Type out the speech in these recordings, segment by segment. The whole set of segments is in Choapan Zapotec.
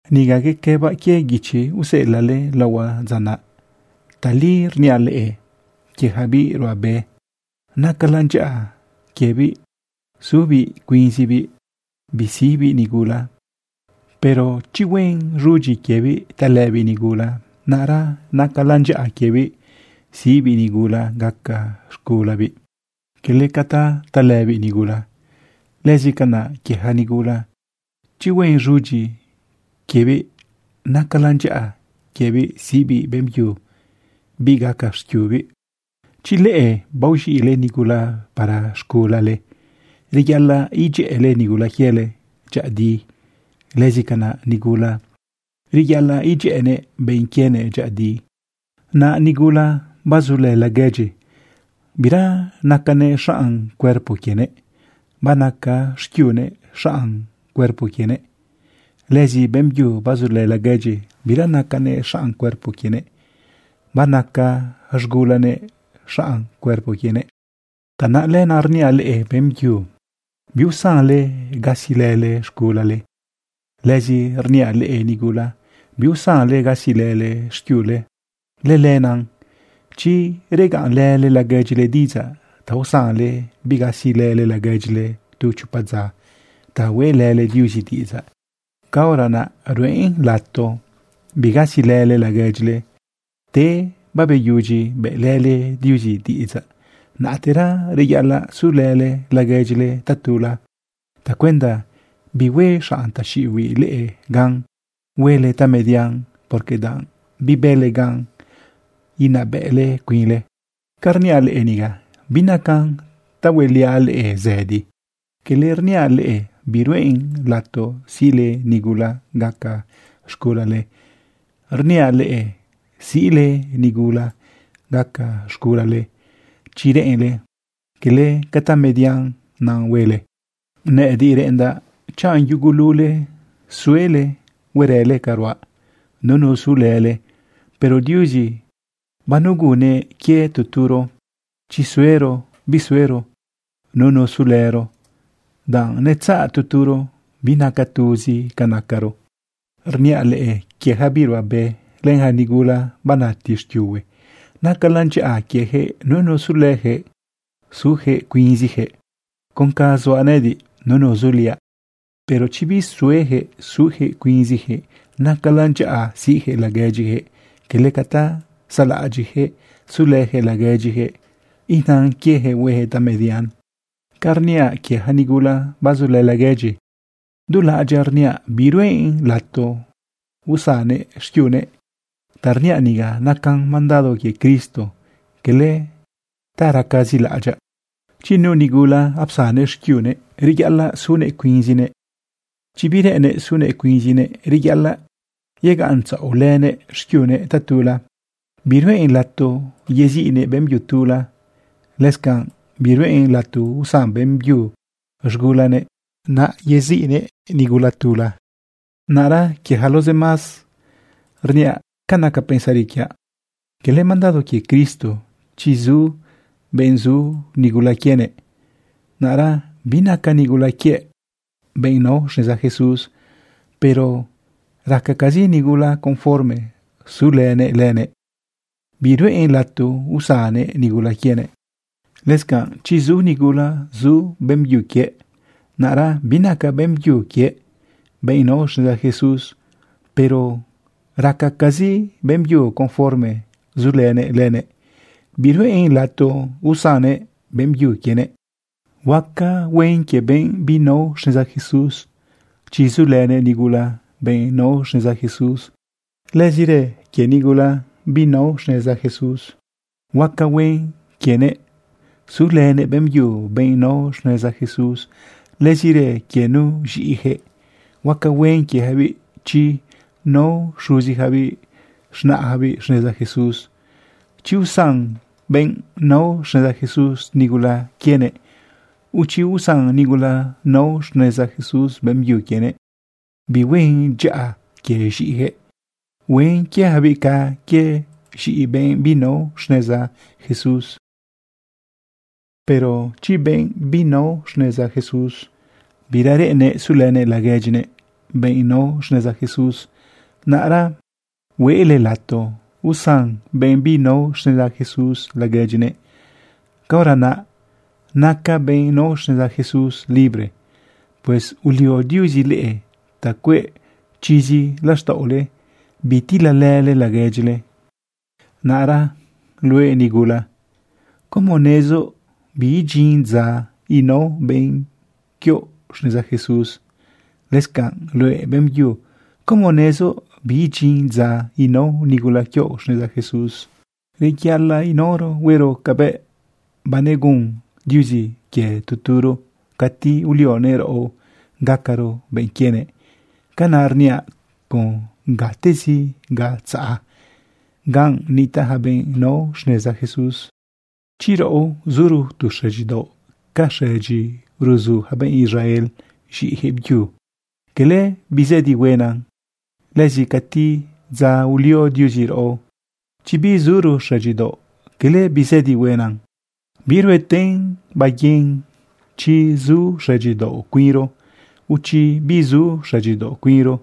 Niga yequëbaꞌ quie guichi useꞌelaꞌle laohuaꞌ dza naꞌ. Tali rniaꞌ leꞌe quie yaca biꞌ ruꞌabe, nacalan dyaꞌa quiebiꞌ zubiꞌ cuinzibiꞌ bisiꞌbiꞌ nigula. Pero chi huen z̃udyi quiebiꞌ talëbiꞌ nigula, naꞌra nacalan dyaꞌa quiebiꞌ siꞌbiꞌ nigula gaca z̃gulabiꞌ, cala ca ta talëbiꞌ nigula. Lëzi canaꞌ quie yaca nigula, chi huen z̃udyi quiebiꞌ, nacalan dyaꞌa quiebiꞌ siꞌbiꞌ beꞌmbyu biꞌ gaca xquiubiꞌ. Chi leꞌe baoz̃iꞌle nigula para z̃gulale, reyaꞌalaꞌ idyëꞌële nigula quiele dyëꞌëdi. Lëzi canaꞌ nigula, reyaꞌalaꞌ idyëꞌënëꞌ benꞌ quienëꞌ dyëꞌëdi. Naꞌ nigula bazulë laguedyi, bira nacanëꞌ xaꞌn cuerpo quienëꞌ, banaca xquiunëꞌ xaꞌn cuerpo quienëꞌ. Lëzi beꞌmbyu bazulë laguedyi, bira nacanëꞌ xaꞌn cuerpo quienëꞌ, banaca z̃gulanëꞌ xaꞌn cuerpo quienëꞌ. Tanaꞌ lenaꞌ rniaꞌ leꞌe beꞌmbyu, biusanle gasilële z̃gulale. Lëzi rniaꞌ leꞌe nigula, biusanle gasilële xquiule. Lëlenaꞌ chi regaꞌnlële laguedyile diꞌidzaꞌ ta usanle bigasilële laguedyile tu chopa dza ta hueꞌlële Diuzi diꞌidzaꞌ, caora naꞌ ruꞌen lato bigasilële laguedyile. Te beyudyi bëꞌlële Diuzi diꞌidzaꞌ, naꞌtera reyaꞌalaꞌ sulële laguedyile tatula tacuenda bihue xaꞌn taxiꞌibiꞌ leꞌe gan huele tamedian, porque danꞌ bibële gan inabëꞌle cuinle. Ca rniaꞌ leꞌe niga binacan ta hueliaꞌ leꞌe zëdi. Cala rniaꞌ leꞌe biruꞌen lato siꞌle nigula gaca z̃gulale. Rniaꞌ leꞌe siꞌle nigula gaca z̃gulale chi reꞌenle, cala tamedian naꞌ huele. Nëꞌëdiꞌ reꞌendaꞌ chanꞌ yugulule suele huerële ca ruaꞌ, nunu sulële. Pero Diuzi banegunnëꞌ quie tu turo, chi suero bisuero nunu sulëro, danꞌ netzaꞌ tu turo. Binaca tuzi ca nacaro. Rniaꞌ leꞌe quie yaca biꞌ ruꞌabe len yaca nigula banati xquiuhue, nacalan dyaꞌa quieyaquëꞌ nunu sulëyaquëꞌ su cuinziyaquëꞌ con ca zuaꞌ nëꞌëdiꞌ, nunu zuliaꞌ. Pero chi bisueyaquëꞌ suyaquëꞌ cuinziyaquëꞌ, nacalan dyaꞌa siꞌyaquëꞌ laguedyiyaquëꞌ, cala ca ta saꞌlaꞌadyiꞌyaquëꞌ sulëjëꞌ laguedyijëꞌ inan quiejëꞌ huejëꞌ tamedian. Ca rniaꞌ quie yaca nigula bazulë laguedyi, dulaꞌadyaꞌ rniaꞌ biruꞌen lato usannëꞌ xquiunëꞌ. Ta rniaꞌ niga nacan mandado quie Cristo, cala ta racazi laꞌadyaꞌ. Chi nu nigula apsannëꞌ xquiunëꞌ, reyaꞌalaꞌ sunëꞌ cuinzinëꞌ. Chi bireꞌennëꞌ sunëꞌ cuinzinëꞌ, reyaꞌalaꞌ yegaꞌntzaꞌolënëꞌ xquiunëꞌ tatula. Biruꞌen lato yeziꞌnëꞌ beꞌmbyu tula. Lëscanꞌ biruꞌen lato usan beꞌmbyu z̃gulanëꞌ naꞌ yeziꞌnëꞌ nigula tula. Naꞌra quie yaca los demás, rniaꞌ ca naca pensari quiaꞌ, cala mandado quie Cristo. Chi zu benꞌ zu nigula quienëꞌ, naꞌra binaca nigula quiëꞌ benꞌ nao xneza Jesús, pero racacazi nigula conforme sulënëꞌ lënëꞌ, biruꞌen lato usannëꞌ nigula quienëꞌ. Lëscanꞌ chi zu nigula zu beꞌmbyu quie, naꞌra binaca beꞌmbyu quiëꞌ benꞌ nao xneza Jesús, pero racacazi beꞌmbyu conforme sulënëꞌ lënëꞌ, biruꞌen lato usannëꞌ beꞌmbyu quienëꞌ. Huaca huen quie benꞌ binao xneza Jesús chi sulënëꞌ nigula, benꞌ nao xneza Jesús. Lëzirë quie nigula binao xneza Jesús, huaca huen quienëꞌ sulënëꞌ beꞌmbyu, benꞌ nao xneza Jesús. Lëzirë quie nu z̃iꞌiyaquëꞌ, huaca huen quieyacabiꞌ chi nao xuziyacabiꞌ z̃naꞌyacabiꞌ xneza Jesús. Chi usan benꞌ nao xneza Jesús nigula quienëꞌ o chi usan nigula nao xneza Jesús beꞌmbyu quienëꞌ, bihuen dyaꞌa quie z̃iꞌiyaquëꞌ. Huen quieyacabiꞌ ca quie z̃iꞌi benꞌ binao xneza Jesús. Pero chi benꞌ binao xneza Jesús bira reꞌennëꞌ sulënëꞌ laguedyinëꞌ, benꞌ nao xneza Jesús, naꞌra hueꞌle lato usan benꞌ binao xneza Jesús laguedyinëꞌ. Caora naꞌ naca benꞌ nao xneza Jesús libre. Pues ulio Diuzi leꞌe ta cueꞌ chizi laxtaꞌole bitilalële laguedyile. Naꞌra luëꞌ nigula, ¿cómo nezoꞌ biidyin dza inao benꞌ quioꞌ xneza Jesús? Lëscanꞌ luëꞌ beꞌmbyu, ¿cómo nezoꞌ biidyin dza inao nigula quioꞌ xneza Jesús? Reyaꞌalaꞌ inaoro huero cabëꞌ banegun Diuzi quie tu turo cati ulionëꞌ raꞌo gacaro benꞌ quienëꞌ. Canaꞌ rniaꞌ con gatezi ga tzaꞌ, ganꞌ nitaꞌ yaca benꞌ nao xneza Jesús. Chi raꞌo zuro tu xëdyidaoꞌ ca xëdyi ruzu yaca benꞌ Israel z̃iꞌiyaquëꞌ byu, cala bizëdi huena. Lëzi cati dza ulio Diuzi raꞌo, chi bizuro xëdyidaoꞌ, cala bizëdi huena. Birueten baiguin chi su xëdyidaoꞌ cuinro, o chi bisu xëdyidaoꞌ cuinro.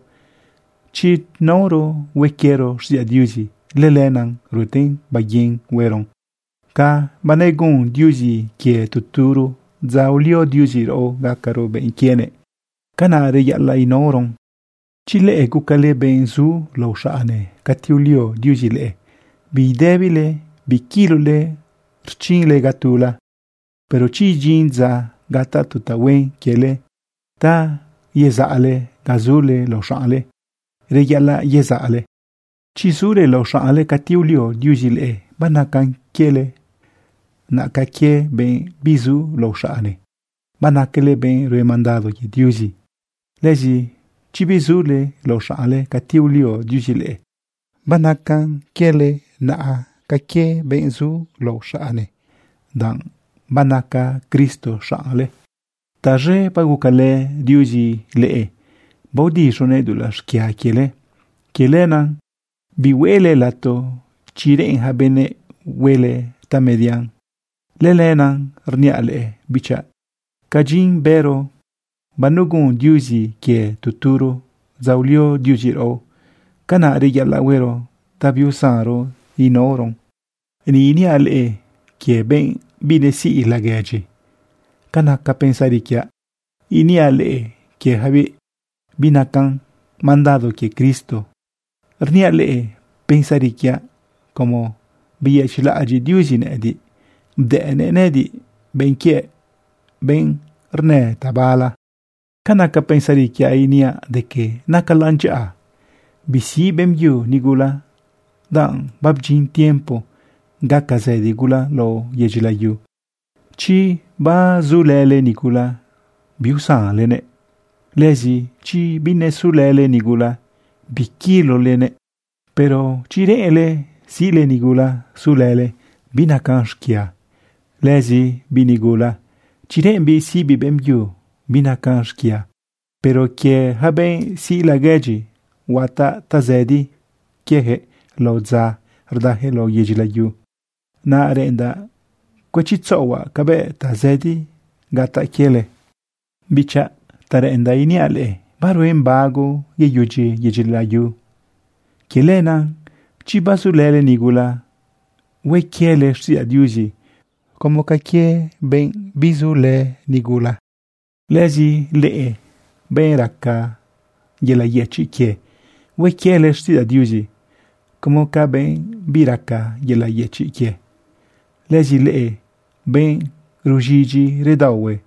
Chi naoro hue quiero xtiꞌidzaꞌ Diuzi, lëlenaꞌ rueten baiguin hueron. Ca banegun Diuzi quie tu turo dza ulio Diuzi raꞌo gacaro benꞌ quienëꞌ, canaꞌ reyaꞌalaꞌ inaoron. Chi leꞌe gucale benꞌ zu lao xaꞌne cati ulio Diuzi leꞌe, bidëbile biquilole rchinle ga tula. Pero chi idyin dza gataꞌ tu tahuen quiele ta yezaꞌle ga zule lao xaꞌne, reyaꞌalaꞌ yezaꞌle. Chi zule lao xaꞌne cati ulio Diuzi leꞌe, banacan quiele naꞌa ca quie benꞌ bizu lao xaꞌne. Banacale benꞌ rue mandado quie Diuzi. Lëzi chi bizule lao xaꞌne cati ulio Diuzi leꞌe, banacan quiele naꞌa ca quie benꞌ zu lao xaꞌne, danꞌ banaca Cristo xaꞌnle. Taz̃e bagucalë Diuzi leꞌe baodiz̃unëꞌ dulaꞌ xquia quiele. Quie lenaꞌ bihueꞌle lato chi reꞌen yaca benëꞌ huele tamedian. Lëlenaꞌ rniaꞌ leꞌe bichaꞌ, ca dyin bëro banegun Diuzi quie tu turo dza ulio Diuzi raꞌo, canaꞌ reyaꞌalaꞌ huero biusanron inaoron. Ni iniaꞌ leꞌe quie benꞌ binesiꞌ laguedyi. Ca naca pensari quiaꞌ iniaꞌ leꞌe quieyacabiꞌ, binacan mandado quie Cristo. Rniaꞌ leꞌe pensari quiaꞌ como beyëchiꞌlaꞌadyiꞌ Diuzi nëꞌëdiꞌ, bdëꞌnëꞌ nëꞌëdiꞌ benꞌ quiëꞌ, benꞌ rnë tabala. Ca naca pensari quiaꞌ iniaꞌ de que, nacalan dyaꞌa bisiꞌ beꞌmbyu nigula, danꞌ babdyin tiempo gaca zëdi gula lao yedyi layu. Chi bazulële nigula, biusanlenëꞌ. Lëzi chi binesulële nigula, biquilolenëꞌ. Pero chi reꞌenle siꞌle nigula sulële, binacan xquia. Lëzi biꞌ nigula, chi reꞌembiꞌ siꞌbiꞌ beꞌmbyu, binacan xquia. Pero quie yaca benꞌ siꞌ laguedyi, huataꞌ tazëdi quieyaquëꞌ lao dza rdayaquëꞌ lao yedyi layu. Naꞌ reꞌendaꞌ cuëchitzaꞌohuaꞌ cabëꞌ tazëdi gataꞌ quiele. Bichaꞌ, ta reꞌendaꞌ iniaꞌ leꞌe, baruen bago yeyudyi yedu yedyi layu. Quie lenaꞌ chi bazulële nigula, hue quiele xtiꞌidzaꞌ Diuzi como ca quie bizulële nigula. Lëzi leꞌe benꞌ raca yelaꞌ yëchiꞌ quie, hue quiele xtiꞌidzaꞌ Diuzi como ca benꞌ biraca yelaꞌ yëchiꞌ quie. Lëzi leꞌe benꞌ ruz̃idyi redaohue,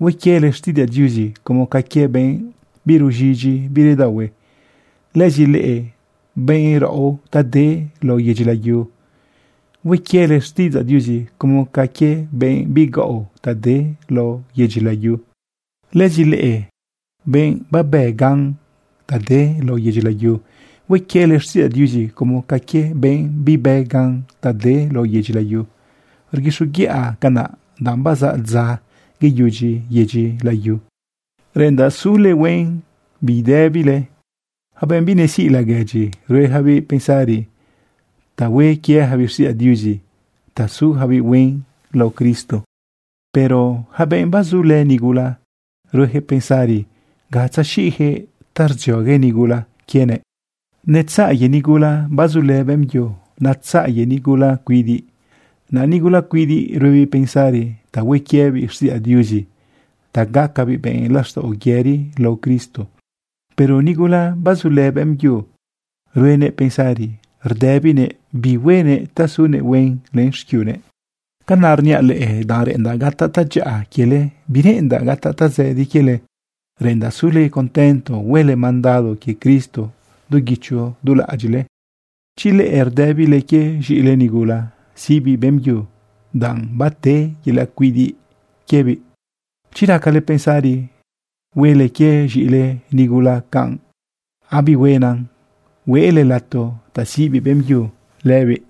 hue quiele xtiꞌidzaꞌ Diuzi como ca quie benꞌ biruz̃idyi biredaohue. Lëzi leꞌe benꞌ raꞌo ta de lao yedyi layu, hue quiele xtiꞌidzaꞌ Diuzi como ca quie benꞌ bigaꞌo ta de lao yedyi layu. Lëzi leꞌe benꞌ babë gan ta de lao yedyi layu, hue quiele xtiꞌidzaꞌ Diuzi como ca quie benꞌ bibë gan ta de lao yedyi layu. Rguixoguiꞌa canaꞌ danꞌ bazaꞌ dza yeyudyi yedu yedyi layu. Reꞌendaꞌ sule huen bidëbile. Yaca benꞌ binesiꞌ laguedyi, rueyacabiꞌ pensari ta hue quieyacabiꞌ xtiꞌidzaꞌ Diuzi ta zuyacabiꞌ huen lao Cristo. Pero yaca benꞌ bazulë nigula, rueyaquëꞌ pensari ga tzexiꞌyaquëꞌ ta rdziogue nigula quienëꞌ. Netzaꞌ quie nigula bazulë beꞌmbyu, netzaꞌ quie nigula cuidiꞌ. Naꞌ nigula cuidiꞌ ruebiꞌ pensari ta hue quiebiꞌ xtiꞌidzaꞌ Diuzi ta gacabiꞌ benꞌ laxtaꞌo yëri lao Cristo. Pero nigula bazulë beꞌmbyu, ruenëꞌ pensari rdëbinëꞌ bi huenëꞌ ta zunëꞌ huen len xquiunëꞌ. Canaꞌ rniaꞌ leꞌe danꞌ reꞌendaꞌ gataꞌ tadyaꞌa quiele, bireꞌendaꞌ gataꞌ tazëdi quiele. Reꞌendaꞌ sule contento huele mandado quie Cristo du guicho du laꞌadyiꞌle. Chi leꞌe rdëbile quie z̃iꞌile nigula siꞌbiꞌ beꞌmbyu, danꞌ bate yelaꞌ cuidiꞌ quiebiꞌ, chi racale pensari huele quie z̃iꞌile nigula canꞌ, abihuena hueꞌle lato ta siꞌ beꞌmbyu lëbiꞌ.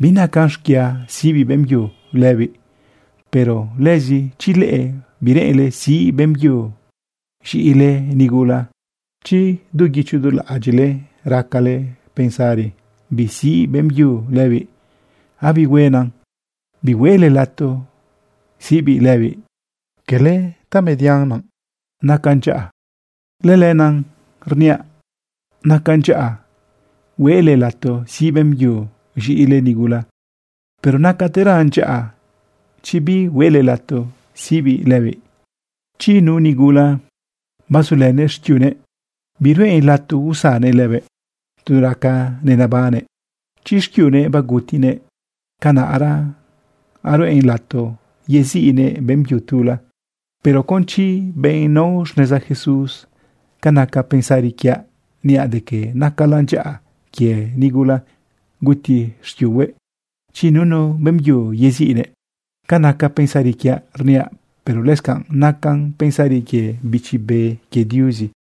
Binacan xquia siꞌ beꞌmbyu lëbiꞌ. Pero lëzi chi leꞌe bireꞌenle siꞌ beꞌmbyu z̃iꞌile nigula, chi du guicho du laꞌadyiꞌle racale pensari bisiꞌ beꞌmbyu lëbiꞌ, abihuena bihueꞌle lato siꞌbiꞌ lëbiꞌ. Cala tamedian naꞌ, nacan dyaꞌa. Lëlenaꞌ rniaꞌ nacan dyaꞌa hueꞌle lato siꞌ beꞌmbyu z̃iꞌile nigula, pero nacateran dyaꞌa chi bihueꞌle lato siꞌbiꞌ lëbiꞌ. Chi nu nigula bazulënëꞌ xquiunëꞌ, biruꞌen lato usannëꞌ lëbëꞌ tu raca nebannëꞌ. Chi xquiunëꞌ bagutinëꞌ, canaꞌra ruꞌen lato yeziꞌnëꞌ beꞌmbyu tula, pero con chi benꞌ nao xneza Jesús. Ca naca pensari quiaꞌ niaꞌ de que nacalan dyaꞌa quie nigula guti xquiuhue, chi nunu beꞌmbyu yeziꞌnëꞌ. Ca naca pensari quiaꞌ rniaꞌ, pero lëscanꞌ nacan pensari quie Bichi Be quie Diuzi.